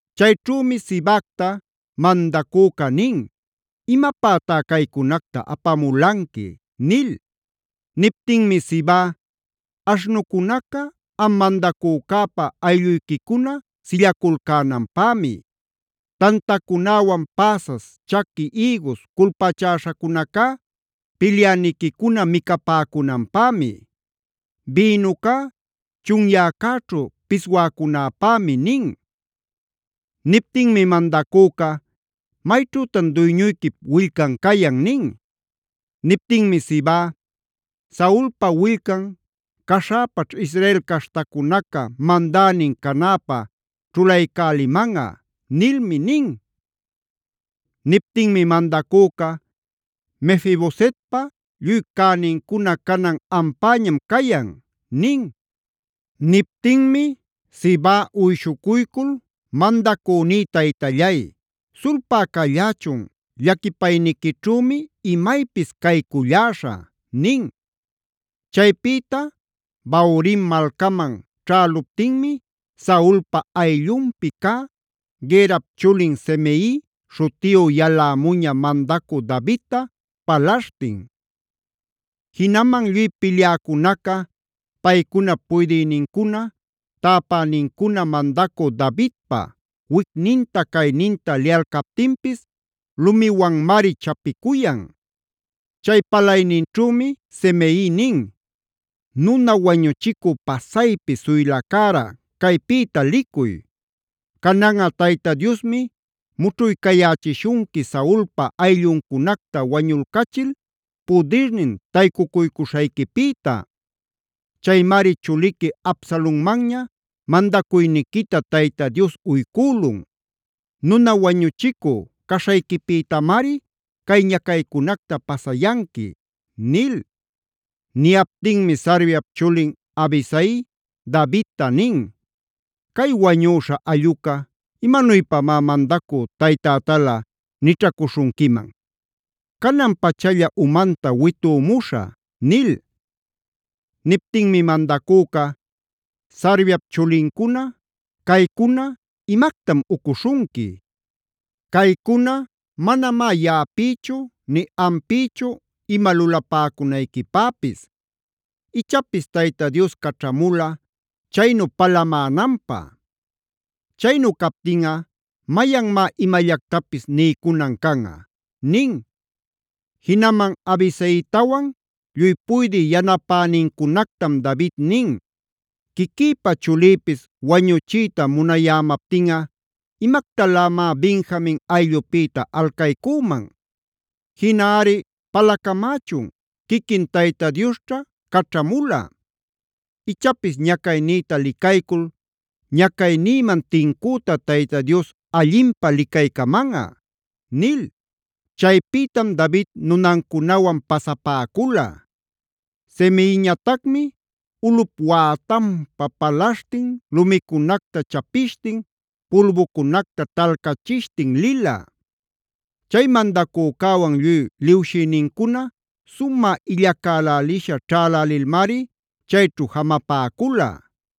Chayćhümi Sibacta mandacüca nin: “¿Imapätá caycunacta apamulanqui?” nil. Niptinmi Siba: “Aśhnucunaca am mandacücäpä aylluyquicuna sillaculcänanpämi. Tantacunäwan päsas, chaqui ïgus culpachäśhacunacá pilyäniquicuna micapäcunanpämi. Bïnucá chunyäcäćhu piswäcunapämi” nin. Niptinmi mandacüca: “¿Mayćhütan duyñuyquip willcan cayan?” nin. Niptinmi Siba: “ ‘Saulpa willcan caśhäpaćh Israel caśhtacunaca mandänin canäpä ćhulaycälimanꞌa’ nilmi” nin. Niptinmi mandacüca: “Mefi-bosetpa lluy cänincuna canan ampäñam cayan” nin. Niptinmi Siba uyshucuycul: “Mandacüní taytallay, sulpä callächun llaquipayniquićhümi imaypis cayculläśhä” nin. Chaypïta Bahurim malcaman ćhäluptinmi Saulpa ayllunpi cä Gerap chulin Simei śhutiyu yalämuña mandacü Davidta palaśhtin. Jinaman lluy pilyäcunaca, paycunap puydïnincuna, täpänincuna mandacü Davidpa wicninta-cayninta liyalcaptinpis lumiwanmari chapicuyan. Chay palayninćhümi Simei nin: “¡Nuna wañuchicü pasaypi suylacära caypïta licuy! Cananꞌa Tayta Diosmi mućhuycayächishunqui Saulpa aylluncunacta wañulcachil pudirnin taycucuycuśhayquipïta. Chaymari chuliqui Absalonmanña mandacuyniquita Tayta Dios uycülun. Nuna wañuchicü caśhayquipïtamari cay ñacaycunacta pasayanqui” nil. Niyaptinmi Sarviap chulin Abisai Davidta nin: “¿Cay wañüśha allꞌuca imanuypamá mandacü taytätalä nićhacuśhunquiman? ¡Canan-pachalla umanta witümuśhä!” nil. Niptinmi mandacüca: “Sarviap chulincuna, caycuna ¿imactam ucuśhunqui? Caycuna manamá yaꞌapïchu ni ampïchu ima lulapäcunayquipäpis. Ichapis Tayta Dios caćhamula chaynu palamänanpä. Chaynu captinꞌa ¿mayanmá imallactapis niycunan canꞌa?” nin. Jinaman Abisaitawan lluy puydï yanapänincunactam David nin: “Quiquïpa chulïpis wañuchiyta munayämaptinꞌa ¿imactalämá Benjamin ayllupïta alcaycüman? Jinaꞌari palacamächun quiquin Tayta Diosćha caćhamula. Ichapis ñacaynïta licaycul ñacaynïman tincüta Tayta Dios allinpä licaycamanꞌa” nil. Chaypïtam David nunancunawan pasapäcula. Simeiñatacmi ulꞌup wätanpa palaśhtin, lumicunacta chapishtin, pulbucunacta talcachishtin lila. Chay mandacücäwan lluy liwshïnincuna sumä illacälälisha ćhalälilmari chayćhu jamapäcula.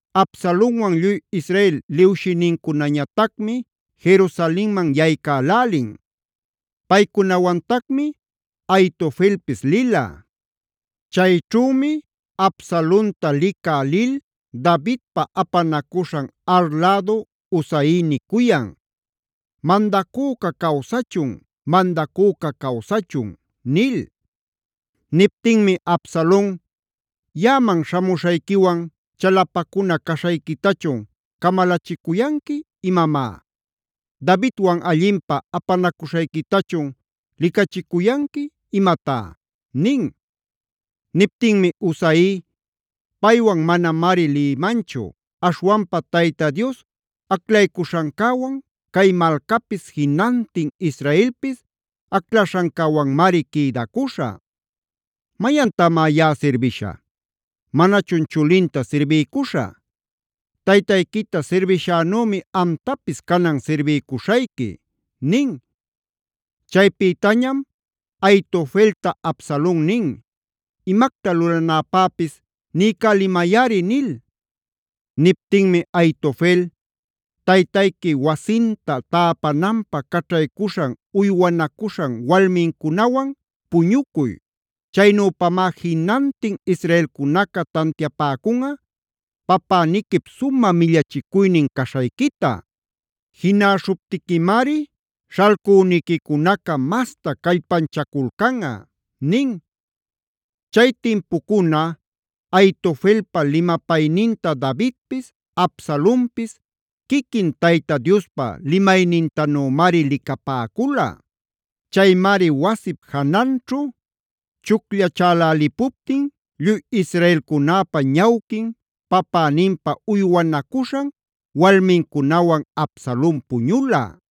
Absalonwan lluy Israel liwshïnincunañatacmi Jerusalenman yaycälälin. Paycunawantacmi Ahitofelpis lila. Chayćhümi Absalonta licä lil Davidpa apanacuśhan Ar lädu Husai nicuyan: “¡Mandacüca cawsachun! ¡Mandacüca cawsachun!” nil. Niptinmi Absalon: “¿Yaꞌaman śhamuśhayquiwan chalapacuna caśhayquitachun camalachicuyanqui imamá? ¿Davidwan allinpä apanacuśhayquitachun licachicuyanqui imatá?” nin. Niptinmi Husai: “Paywan manamari lïmanchu. Aśhwanpa Tayta Dios aclaycuśhancäwan, cay malcapis, jinantin Israelpis aclaśhancäwanmari quïdacuśhä. ¿Mayantamá yaꞌa sirbishä? ¿Manachun chulinta sirbiycuśhä? Taytayquita sirbishänümi amtapis canan sirbiycuśhayqui” nin. Chaypïtañam Ahitofelta Absalon nin: “Imacta lulanäpäpis niycälimayꞌari” nil. Niptinmi Ahitofel: “Taytayqui wasinta täpananpä caćhaycuśhan uywanacuśhan walmincunawan puñucuy. Chaynüpamá jinantin israelcunaca tantiapäcunꞌa papäniquip sumä millachicuynin caśhayquita. Jinäśhuptiquimari śhalcüniquicunaca masta callpanchaculcanꞌa” nin. Chay timpucuna Ahitofelpa limapayninta Davidpis, Absalonpis quiquin Tayta Diospa limaynintanümari licapäcula. Chaymari wasip jananćhu chucllachälälipuptin lluy israelcunäpa ñawquin papäninpa uywanacuśhan walmincunawan Absalon puñula.b